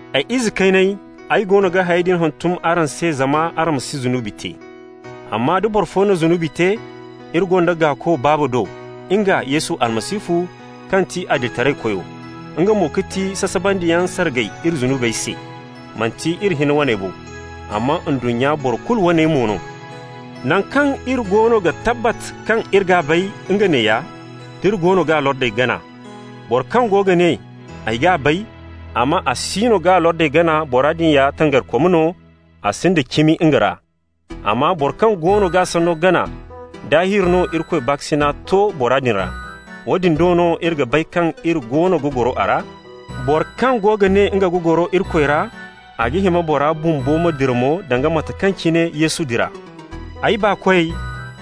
Ay ize kayney, ay goono ga hayey din hantum araŋ se zama araŋ ma si zunubi te. Amma da boro fo na zunubi te, iri gonda Gaako Baaba do, nga Yesu Almasihu kaŋ ti Adilitaraykoy. Nga mo ga ti sasabandiyaŋ sargay iri zunubey se. Manti iri hinne waney bo, amma ndunnya boro kulu waney mo no. Naŋ kaŋ iri goono ga tabbat kaŋ iri g'a bay, nga neeya: d'iri goono g'a lordey gana. Boro kaŋ go ga ne: «Ay g'a bay,» amma a siino g'a lordey gana, bora din ya tangarikom no, a sinda cimi nga ra. Amma boro kaŋ goono g'a sanno gana, daahir no Irikoy baakasina to bora din ra. Woodin do no iri ga bay kaŋ iri goono ga goro a ra. Boro kaŋ go ga ne nga ga goro Irikoy ra, a ga hima bora bumbo ma dira mo danga mate kaŋ cine Yesu dira. Ay baakoy,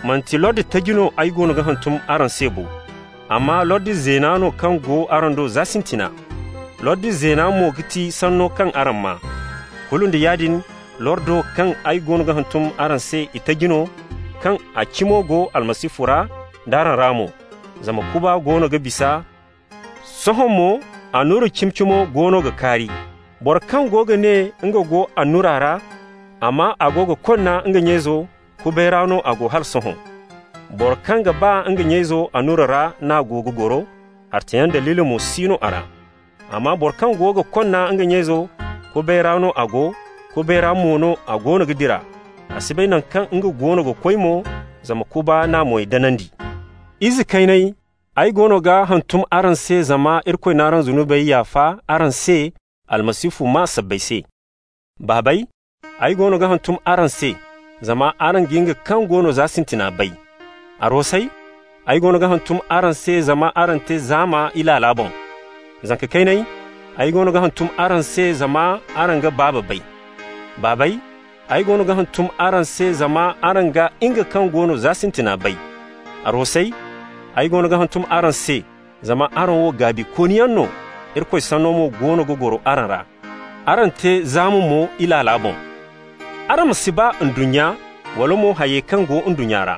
manti lordi taji no ay goono ga hantum araŋ se bo, amma lordi zeena no kaŋ go araŋ do za sintina. Lordi zeena mo ga ti sanno kaŋ araŋ maa. Kulu nda yaadin, lordo kaŋ ay goono ga hantum araŋ se itaji no, kaŋ a cimo go Almasihu ra d'araŋ ra mo. Zama kuba goono ga bisa, sohõ mo annura cimi-cimo goono ga kaari. Boro kaŋ go ga ne nga go annura ra, amma a go ga konna nga nya-izo, kubay ra no a go hala sohõ. Boro kaŋ ga ba nga nya-izo, annura ra n'a go ga goro, hartayaŋ daliili mo si no a ra. Amma boro kaŋ go ga konna nga nya-izo, kubay ra no a go, kubay ra mo no a goono ga dira. A si bay naŋ kaŋ nga goono ga koy mo, zama kuba n'a moy danandi. Ize kayney, ay goono ga hantum araŋ se, zama Irikoy n'araŋ zunubey yaafa araŋ se Almasihu maa sabbay se. Baabey, ay goono ga hantum araŋ se, zama araŋ ga nga kaŋ go no za sintina bay. Arwasey, ay goono ga hantum araŋ se, zama araŋ te zaama Ilaala boŋ. Zanka kayney, ay goono ga hantum araŋ se, zama araŋ ga Baaba bay. Baabey, ay goono ga hantum araŋ se, zama araŋ ga nga kaŋ go no za sintina bay. Arwasey, ay goono ga hantum araŋ se, zama araŋ wo gaabikooniyaŋ no, Irikoy sanno mo goono ga goro araŋ ra. Araŋ te zaama mo Ilaala boŋ. Araŋ ma si ba ndunnya, wala mo hayey kaŋ go ndunnya ra.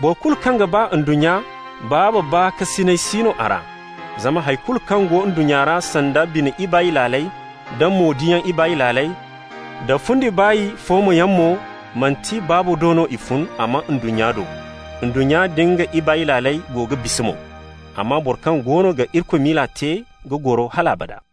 Boro kulu kaŋ ga ba ndunnya, Baaba baakasinay si no a ra. Zama hay kulu kaŋ go ndunnya ra, sanda bine ibaay laaley, da mo-diyaŋ ibaay laaley, da fundi baay foomayaŋ mo, manti Baaba do no i fun, amma ndunnya do. Ndunnya nda nga ibaay laaley go ga bisa mo. Amma boro kaŋ goono ga Irikoy miila te ga goro hal abada.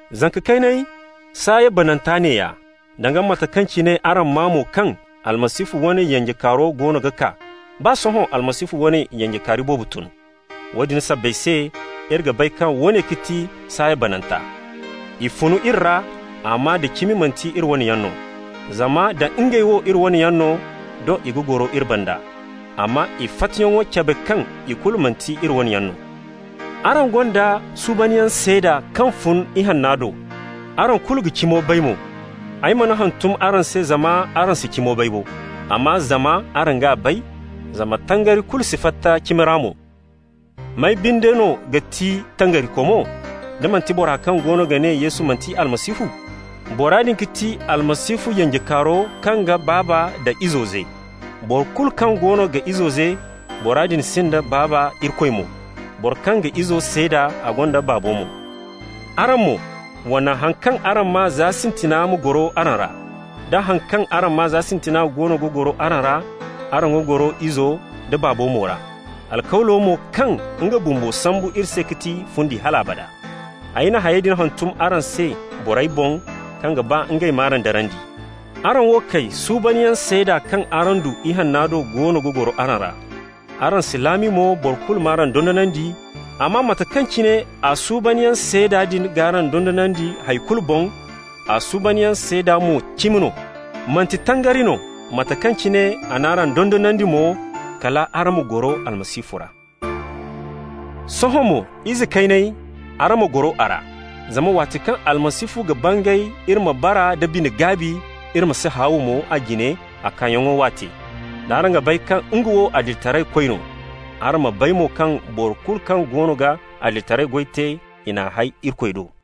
Zanka kayney, saaya bananta neeya. Danga mate kaŋ cine araŋ maa mo kaŋ Almasihu wane yanjekaaro goono ga kaa, baa sohõ Almasihu wane yanjekaari boobo tun. Woodin sabbay se iri ga bay kaŋ woone ga ti saaya bananta. I fun iri ra, amma da cimi manti iri wane yaŋ no. Zama nda ngey wo iri waney yaŋ no, doŋ i ga goro iri banda. Amma i fattayaŋo cabe kaŋ ikulu manti iri wane yaŋ no. Araŋ gonda suubanyaŋ seeda kaŋ fun Ihanna do, araŋ kulu ga cimo bay mo. Ay mana hantum araŋ se zama araŋ si cimo bay bo, amma zama araŋ g'a bay, zama tangari kulu si fatta cimi ra mo. May binde no ga ti tangarikomo, da manti bora kaŋ goono ga ne Yesu manti Almasihu? Bora din ga ti Almasihu yanjekaaro kaŋ ga Baaba nda Izo ze. Boro kulu kaŋ goono ga Izo ze, bora din sinda Baaba Irikoy mo. Boro kaŋ ga Izo seeda, a gonda Baabo mo. Araŋ mo, wa naŋ haŋ kaŋ araŋ maa za sintina ma goro araŋ ra. Da haŋ kaŋ araŋ maa za sintina goono ga goro araŋ ra, araŋ ga goro Izo da Baabo mo ra. Alkawlo mo kaŋ nga bumbo sambu iri se ga ti fundi hal abada. Ay na hayey din hantum araŋ se borey boŋ kaŋ ga ba ngey m'araŋ darandi. Araŋ wo kay, suubanyaŋ seeda kaŋ araŋ du Ihanna do goono ga goro araŋ ra. Araŋ si laami mo boro kulu m'araŋ dondonandi, amma mate kaŋ cine a suubanyaŋ seeda din g'araŋ dondonandi hay kulu boŋ, a suubanyaŋ seeda mo cimi no, manti tangari no. Mate kaŋ cine a n'araŋ dondonandi mo, kal araŋ ma goro Almasihu ra. Sohõ mo, ize kayney, araŋ ma goro a ra. Zama waati kaŋ Almasihu ga bangay iri ma bara nda bine-gaabi, iri ma si haaw mo a jine a kaayaŋo waate. D'araŋ ga bay kaŋ nga wo adilitaraykoy no, araŋ ma bay mo kaŋ boro kulu kaŋ goono ga adilitaray goy te, i n'a hay Irikoy do.